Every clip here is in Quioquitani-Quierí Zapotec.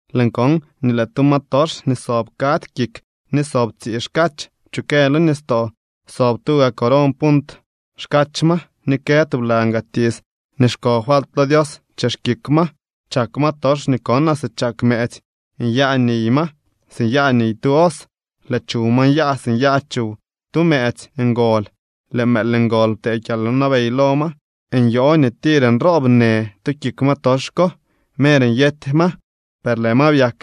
Lëën kon nii lëë tu ma tox nii sob kadzy kik ni sob tsii xkach pchukë lo nistoo. Sob tuga coron punt xkach ma ni kë tublan gaa tiits nii xko falt lo Dios chex kik ma. Chak ma tox nii konaa si chak mëëtsy, nyaa niy ma si nyaa niy tu os, lëë chuw ma nyaa si nyaa chuw tu mëëtsy ngol. Lëë mëël ngol ptee kyalwnabey lo ma. Nyoo nii tir nroob në tu kik ma tox ko. Mer nyety ma, per lëë ma byak,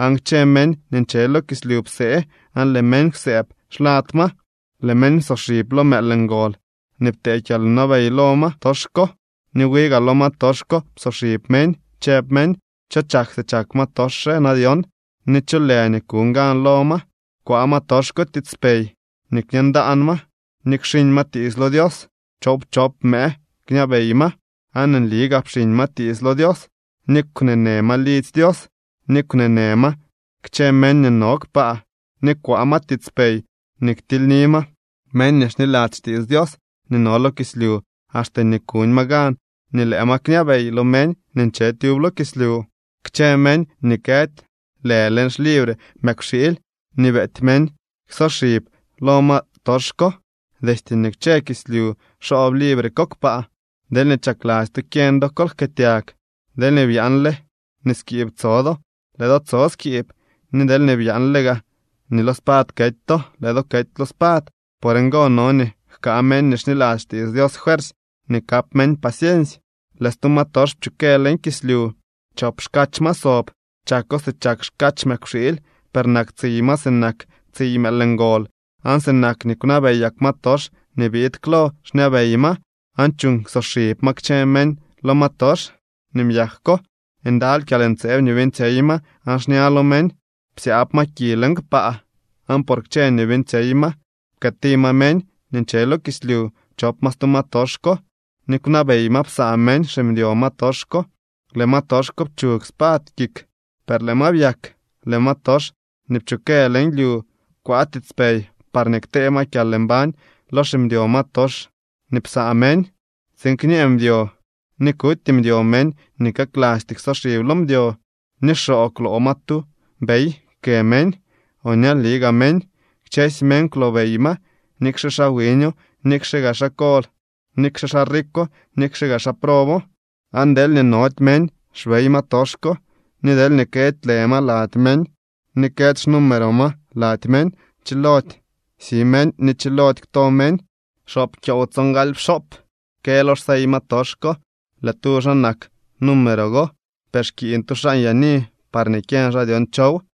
aan kchë meñ nii nche lo kislyu psee aan lëë meñ kwsëëb xlad ma. Lëë meñ psoxib lo mëël ngol nii ptee kyalwnabey lo ma tox ko, ni wi gaa lo ma tox ko psoxib meñ, chëb meñ: —¿Cho chak si chak ma tox re na dyon, ni cho lë nii kuñ gan lo ma? Kwaa ma tox ko tiitspey nii kñee ndaan ma ni kxiñ ma tiits lo Dios. Choowpchop mëë kñabey ma. Aan nli gaa pxiiñ ma tiits lo Dios, ni kwneenë ma lidzy Dios ni kwnee në ma kchë meñ nii no kpaa. Ni kwaa ma tiitspey nii ktilyni ma meñ nii xniladzy xtiits Dios nii no lo kislyu axte nii kuñ ma gan ni lëë ma kñabey lo meñ nii nche tyub lo kislyu. Kchë meñ nii këdy lë leñ xlibre mëkwxiily nii beety meñ ksoxib lo ma tox ko. Destye nii kwche kislyu xoob libre ko kpaa. Deelñee chakladzy to kyeñ do kol jkëëtyag. Deelñee byaanle nii skiib tso do, lëë do tso skiib, ni deelñee byaanle gaa nii lo spad kety to, lëë do kety lo spad. Por ngo no nii jkaa meñ nii xniladzy xtiits Dios fuersy ni kap meñ paciensy. Lëë stu ma tox pchukë leñ kislyu. Chop xkach ma sob. Chako si chak xkach mëkwxiily, per nak tsiy ma sinak tsiy mëël ngol. Aan sinak nii kwnabeyak ma tox nii biid klo xñabey ma, aan chuuñ ksoxib ma kchë meñ lo ma tox nii byak ko. Ndaly kyalntseeb nii beeñtsyey ma aan xña lo meñ psyaab ma ki leñ kpaa. Aan por kchë nii beeñtsyey ma pkëëti ma meñ nii nche lo kislyu chop ma stu ma tox ko ni kwnabey ma psaa meñ ximdyo ma tox ko. Lëë ma tox ko pchug spad kik, per lëë ma byak. Lëë ma tox nii pchukë leñ lyu kwaa tiitspey parñee ktee ma kyalmbañ lo ximdyo ma tox nii psaa meñ, tsiin kñee mdyo ni kuty mdyo meñ nii kaklasty ksoxib lo mdyo. Ni xoo kwloo ma tu bey kë meñ o ñali gaa meñ. Kchësy meñ kwlobey ma, nikxe xaa wiño, nikxe gaa xaa kol, nikxe xaa rikwo, nikxe gaa xaa probo. Aan deelñee nody meñ xbey ma tox ko, ni deelñee këdy lë ma lady meñ, ni këdy xnumero ma lady meñ, chilody si meñ ni chilody kto meñ. Xoop kyoow tsongaly pxoop kë lo xsey ma tox ko. Lë tu xaa nak número go, per xkiiñ tu xaa nyaani parñee kyeñ xaa dyon chow.